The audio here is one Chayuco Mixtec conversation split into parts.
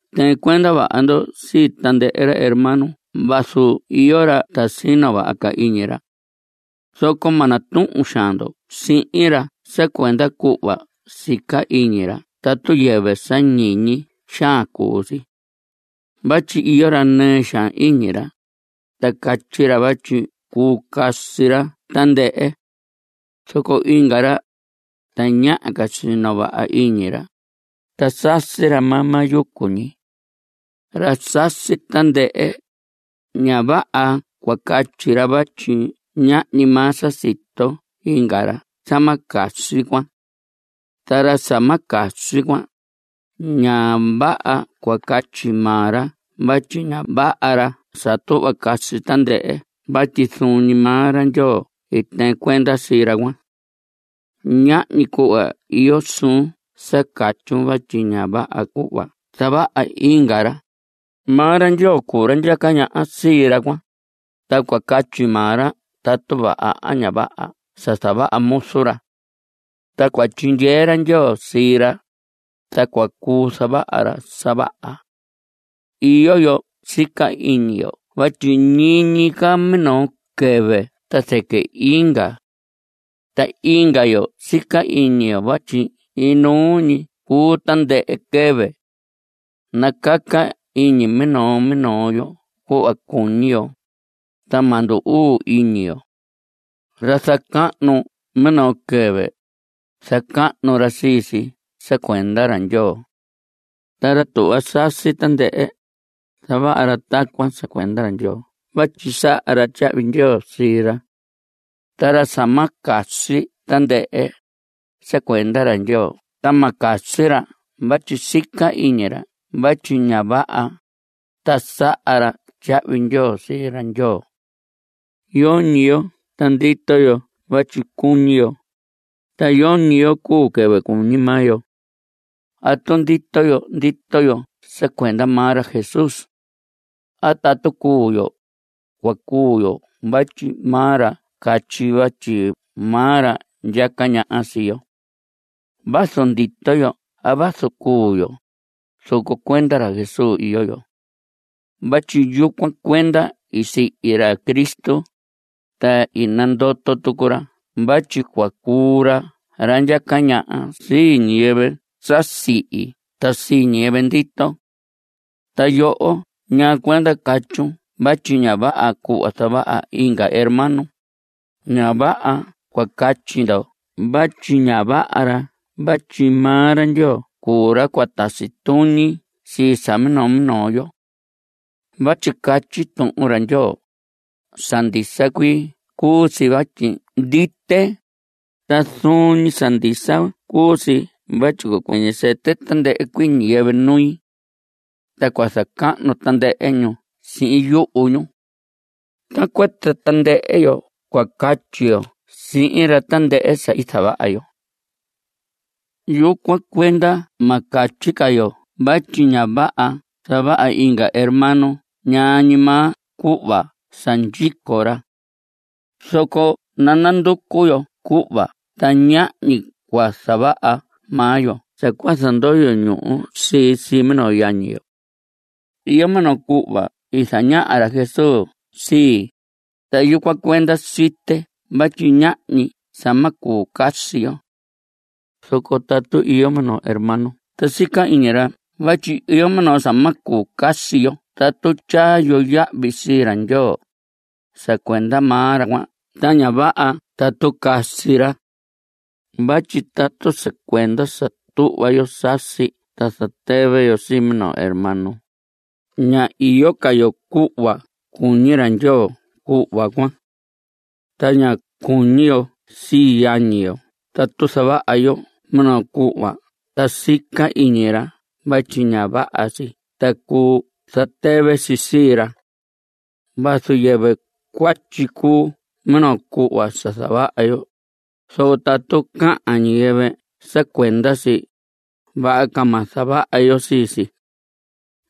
Tɨɨn cuenda vaha ndo sii tandɨhɨ hermano vazu iyo ra ta sino vaha ca iñi ra. Zoco ma natuhun xaan ndo sihin ra sa cuenda cuhva sica iñi ra tatu yɨvɨ sa ñiñi xaan cuu si. Vatyi iyo ra nɨɨ xaan iñi ra, ta catyi ra vatyi cuu casi ra tandɨhɨ. Zoco inga ra, tañaha ca sino vaha iñi ra, ta sasi ra maa maa yucu ñi. Ra sasi tandɨhɨ, ña vaha cua catyi ra vatyi ñahñi maa sa sito inga ra sa ma casi cuan. Ta ra sa ma casi cuan, ña vaha cua catyi maa ra vatyi ña vaha ra sa tuhva sasi tandɨhɨ vatyi zuun ñi maa ra Ndyoo i tɨɨn cuenda sii ra cuan. Ñahñi cuhva iyo suun sa catyun vatyi ña vaha cuhva zavaha inga ra. Maa ra Ndyoo cuu ra ndyaca ñaha sii ra cuan, ta cua catyi maa ra tatu vaha a ña vaha sa zavaha muzu ra. Ta cua tyindyee ra Ndyoo sii ra, ta cua cuu zavaha ra sa vaha. Iyo yo sica iñi yo vatyi ñiñi ca minoo quɨvɨ ta zɨquɨ inga. Ta inga yo sica iñi yo vatyi inuu ñi cuu tandɨhɨ quɨvɨ. Nacaca iñi minoo minoo yo cuhva cuñi yo, ta ma ndu‑uu iñi yo. Ra zacahnu minoo quɨvɨ, zacahnu ra sii si sa cuenda ra Ndyoo. Ta ra tuhva sasi tandɨhɨ, zavaha ra tacuan sa cuenda ra Ndyoo vatyi saha ra tyahvi ndyoo sii ra. Ta ra sa ma casi tandɨhɨ, sa cuenda ra Ndyoo ta ma casi ra vatyi sica iñi ra vatyi ña vaha, ta saha ra tyahvi ndyoo sii ra Ndyoo. Yoñi yo ta ndito yo vatyi cuñi yo. Ta yoñi yo cuu quɨvɨ cuñi maa yo. Tatu ndito yo, ndito yo sa cuenda maa ra Jesús. A tatu cuu yo, cua cuu yo vatyi maa ra catyi, vatyi maa ra ndyaca ñaha sii yo. Vazu ndito yo a vazu cuu yo, zoco cuenda ra Jesús iyo yo vatyi yucuan cuenda i sihi ra Cristo, ta i nandoto tucu ra vatyi cua cuu ra ra ndyaca ñaha sii ñiyɨvɨ sa sihi ta sii ñiyɨvɨ ndito. Ta yoho ¿ñaa cuenda catyun vatyi ña vaha cuhva zavaha inga hermano? Ña vaha cua catyi ndo vatyi ña vaha ra vatyi maa ra Ndyoo cuu ra cua tasi tuñi sii sa minoo minoo yo. Vatyi catyi Tuhun ra Ndyoo: Sa ndisa cuii cuu si vatyi ndite. Ta zuun ñi sa ndisa cuu si vatyi cua cuɨñɨ sɨtɨ tandɨhɨ cuii ñiyɨvɨ nui. Ta cua zacahnu tandɨhɨ ñu sii sihin yuhu ñu. Tacuan ta tandɨhɨ yo cua catyi yo sihin ra tandɨhɨ sa i zavaha yo. Yucuan cuenda ma catyi ca yo vatyi ña vaha sa zavaha inga hermano ñaa ñi maa cuhva sa ndyico ra. Zoco nananducu yo cuhva ta ñahñi cua zavaha maa yo sa cua zandoyo ñuhu si sii minoo yañi yo. Iyo minoo cuhva i zañaha ra Jesús sii, ta yucuan cuenda site vatyi ñahñi sa ma cuu casi yo. Zoco tatu iyo minoo hermano ta sica iñi ra vatyi iyo minoo sa ma cuu casi yo tatu tyaa yo yahvi sii ra Ndyoo, sa cuenda maa ra cuan ta ña vaha tatu casi ra. Vatyi tatu sa cuenda sa tuhva yo sasi ta zatɨvɨ yo sii minoo hermano, ña iyo ca yo cuhva cuñi ra Ndyoo cuhva cuan. Ta ña cuñi yo sii yañi yo tatu zavaha yo minoo cuhva ta sica iñi ra vatyi ña vaha si ta cuu zatɨvɨ si sii ra. Vazu yɨvɨ cuatyi cuu minoo cuhva sa zavaha yo, zoco tatu cahan ñiyɨvɨ sa cuenda si, vaha ca ma zavaha yo sii si.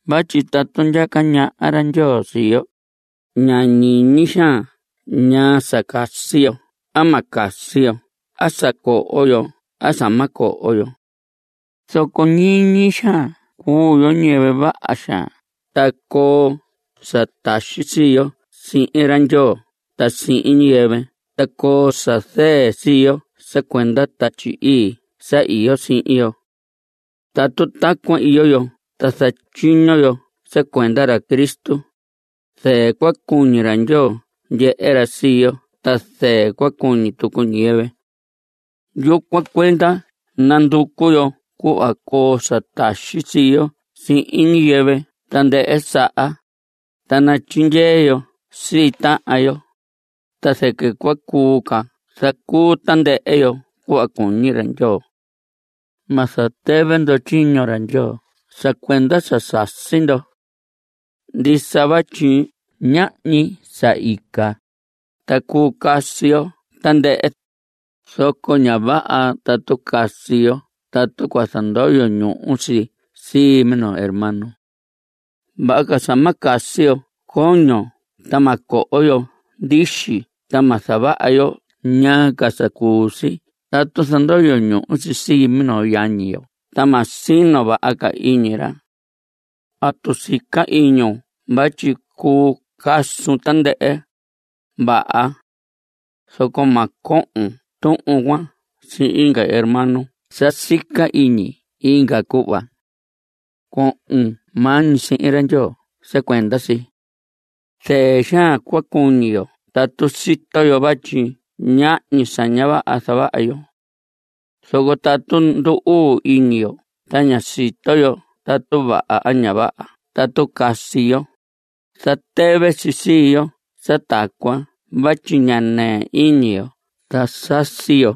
Vatyi tatu ndyaca ñaha ra Ndyoo sii yo, ña ñiñi xaan ñaa sa casi yo a ma casi yo a sa coho yo a sa ma coho yo. Zoco ñiñi xaan cuu yo ñiyɨvɨ vaha xaan ta coo sa taxi sii yo sihin ra Ndyoo ta sihin ñiyɨvɨ ta coo sa zɨɨ sii yo sa cuenda Tatyi Ii sa iyo sihin yo. Tatu tacuan iyo yo ta zatyiño yo sa cuenda ra Cristo, zɨɨ cua cuñi ra Ndyoo ndyehe ra sii yo ta zɨɨ cua cuñi tucu ñiyɨvɨ. Yucuan cuenda nanducu yo cuhva coo sa taxi sii yo sihin ñiyɨvɨ tandɨhɨ saha, ta natyindyee yo sii tahan yo, ta zɨquɨ cua cuu ca zacuu tandɨhɨ yo cuhva cuñi ra Ndyoo. Ma zatɨvɨ ndo tyiño ra Ndyoo sa cuenda sa sasi ndo. Ndisa vatyi ñahñi sa ica, ta cuu casi yo tandɨhɨ, zoco ña vaha tatu casi yo tatu cua zandoyo ñuhu si sii minoo hermano. Vaha ca sa ma casi yo coño ta ma coho yo ndixi ta ma zavaha yo ñaa ca sa cuu si tatu zandoyo ñuhu si sii minoo yañi yo ta ma sino vaha ca iñi ra. Tatu sica iñun vatyi cuu casun tandɨhɨ, vaha. Zoco ma cohon tuhun cuan sihin inga hermano sa sica iñi inga cuhva. Cohon maa ñi sihin ra Ndyoo sa cuenda si. Zɨɨ xaan cua cuñi yo tatu sito yo vatyi ñahñi sa ña vaha zavaha yo. Zoco tatu ndu‑uu iñi yo ta ña sito yo tatu vaha a ña vaha tatu casi yo, zatɨvɨ si sii yo sa tacuan vatyi ña nɨɨ iñi yo ta sasi yo.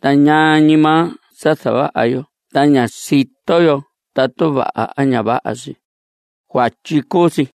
Ta ñaa ñi maa sa zavaha yo ta ña sito yo tatu vaha a ña vaha si, cuatyi cuu si.